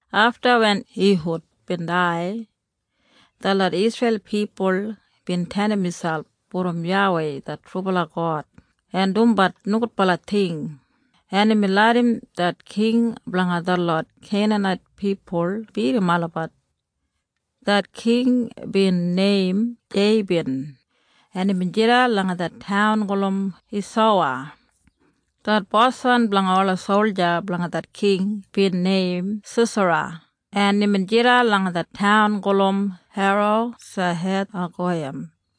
Afta wen Ihud bin dai, detlot Isreil pipul bin tenim miselp brom YAWEI det trubala God en dumbat nogudbala ting, en imbin larram det king blanga detlot Keinanait pipul bidim olabat. Det king bin neim Jeibin, en imbin jidan langa det taun gulum Heisowa. Det boswan blanga ola solja blanga det king bin neim Sisera, en imbin jidan langa det taun gulum Harosehethagoyim.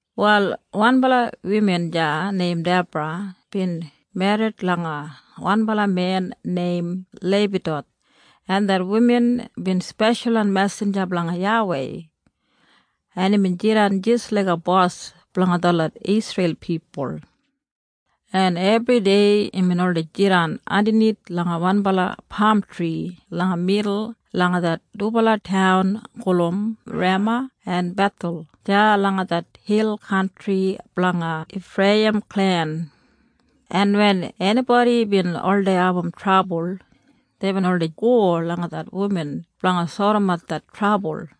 Wal wanbala wuman deya neim Debra bin merrit langa wanbala men neim Leipidoth, en det wuman bin speshalwan mesinja blanga YAWEI, en imbin jidan jis laiga bos blanga detlot Isreil pipul, en ebridei imbin oldei jidan andanith langa wanbala pamtri langa midul langa det dubala taun gulum Rema en Bethel deya langa det hil kantri blanga Ifreiyim klen, en wen enibodi bin oldei abum trabul, deibin oldei go langa det wuman blanga sodimat det trabul.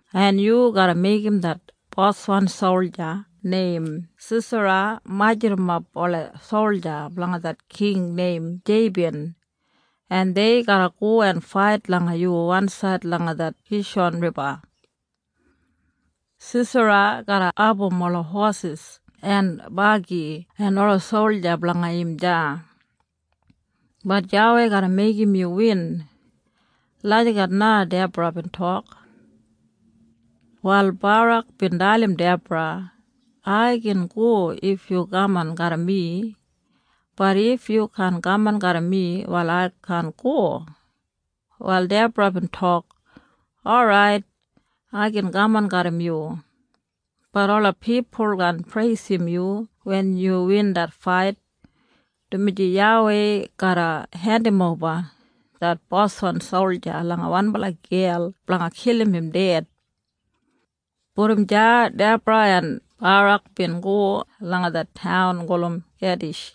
en yu garra meigim det boswan solja neim Sisera majurrumap ola solja blanga det king neim Jeibin, en dei garra go en fait langa yu wansaid langa det Kishan Riba. Sisera garra abum ola hosis en bagi en ola solja blanga im deya. Bat YAWEI garra meigim yu win.” Lagijat na Debra bin tok. Wal Barak bin dalim Debra, “Ai gin go if yu kaman garram mi. Bat if yu kaan kaman garram mi, wal ai kaan go.” Wal Debra bin tok, “Orait, ai gin kaman garram yu. Bat ola pipul kaan preisim yu wen yu win det fait, dumaji YAWEI garra hendimoba det boswan solja langa wanbala gel blanga kilim im ded.” Brom deya Debra en Barak bin go langa det taun gulum Kedish,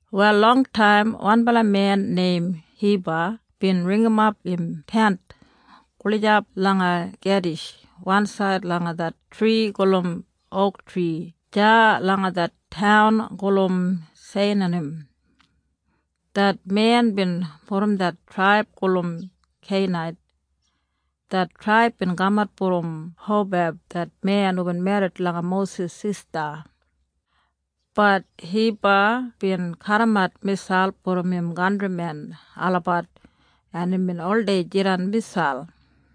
Wal longtaim wanbala men neim Hiba bin ringimap im tent gulijap langa Kedish wansaid langa det tri gulum ouktri deya langa det taun gulum Seinanim. Det men bin brom det traib gulum Kenait. Det traib bin kamat brom Hobab det men hubin merrit langa Mosis sista. Bat Hiba bin kadimat miselp brom im kantrimen olabat, en imbin oldei jidan miselp.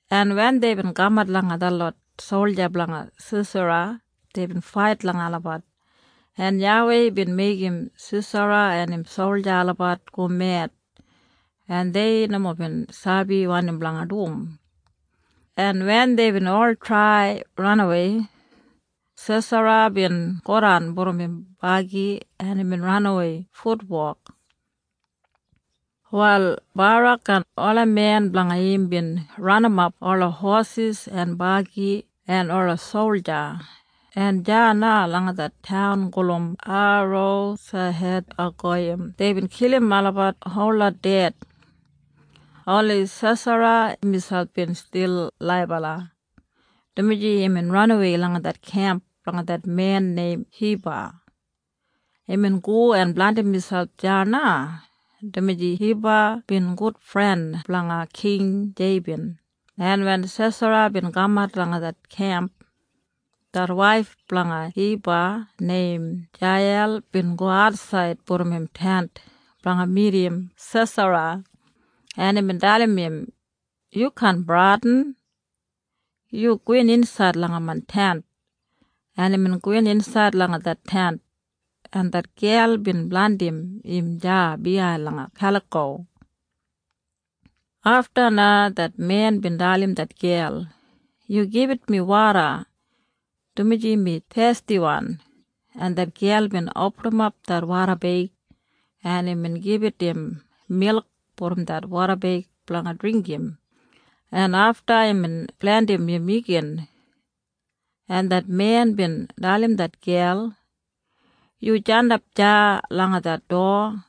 en wen deibin kamat langa detlot solja blanga Sisera, deibin fait langa olabat, en YAWEI bin meigim Sisera en im solja olabat go med, en dei nomo bin sabi wanim blanga dum, en wen deibin ol trai ranawei, Sisera bin godan brom im bagi, en imbin ranawei futwok. Wal Barak en ola men blanga im bin ranimap ola hosis en bagi en ola solja, en deya na langa det taun gulum Harosehethagoyim deibin kilim olabat holot ded. Oni Sisera miselp bin stil laibala, dumaji imbin ranawei langa det kemp blanga det men neim Hiba. Imbin go en blandim miselp deya na, dumaji Hiba bin gudfren blanga King Jeibin, en wen Sisera bin kamat langa det kemp, det waif blanga Hiba neim Jeiyel bin go atsaid brom im tent blanga midim Sisera, en imbin dalim im, “Yu kaan bradin. Yu gowin insaid langa main tent.” En imbin gowin insaid langa det tent, en det gel bin blandim im deya biyain langa kaliko. Afta na det men bin dalim det gel, “Yu gibit mi woda, dumaji mi thestiwan.” En det gel bin opinim det wodabeig, en imbin gibit im milk brom det wodabeig blanga dringgim, en afta imbin blandim im igin, en det men bin dalim det gel, “Yu jandap deya langa det dowa,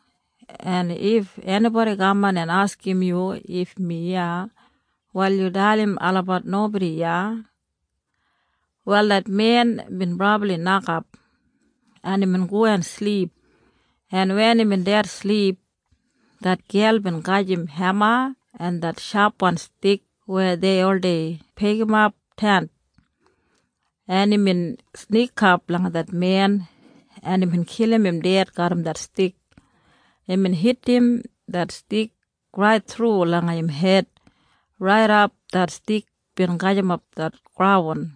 en if enibodi kaman en askim yu if mi iya, wal yu dalim olabat nobodi iya.” Wal det men bin brabli nokap, en imbin go en silip, en wen imbin dedsilip, det gel bin gajim hema en det shapwan stik weya dei oldei pegimap tent, en imbin snikap langa det men, en imbin kilim im ded garram det stik. Imbin hitim det stik rait thru langa im hed raidap det stik bin gajimap det graun.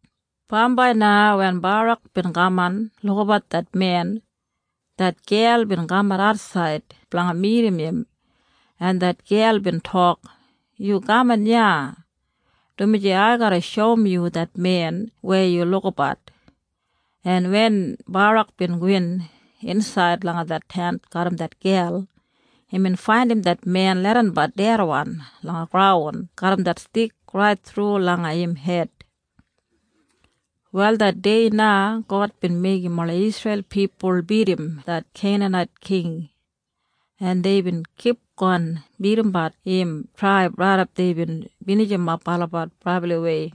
Bambai na wen Barak bin kaman lukabat det men, det gel bin kamat atsaid blanga midim im, en det gel bin tok, “Yu kaman iya, dumaji ai garra shoum yu det men weya yu lukabat.” En wen Barak bin gowin insaid langa det tent garram det gel, imbin faindim det men leidanbat dedwan langa graun garram det stik rait thru langa im hed. Wal det dei na God bin meigim ola Isreil pipul bidim det Keinanait king, en deibin kipgon bidimbat im traib raidap deibin binijimap olabat brabliwei.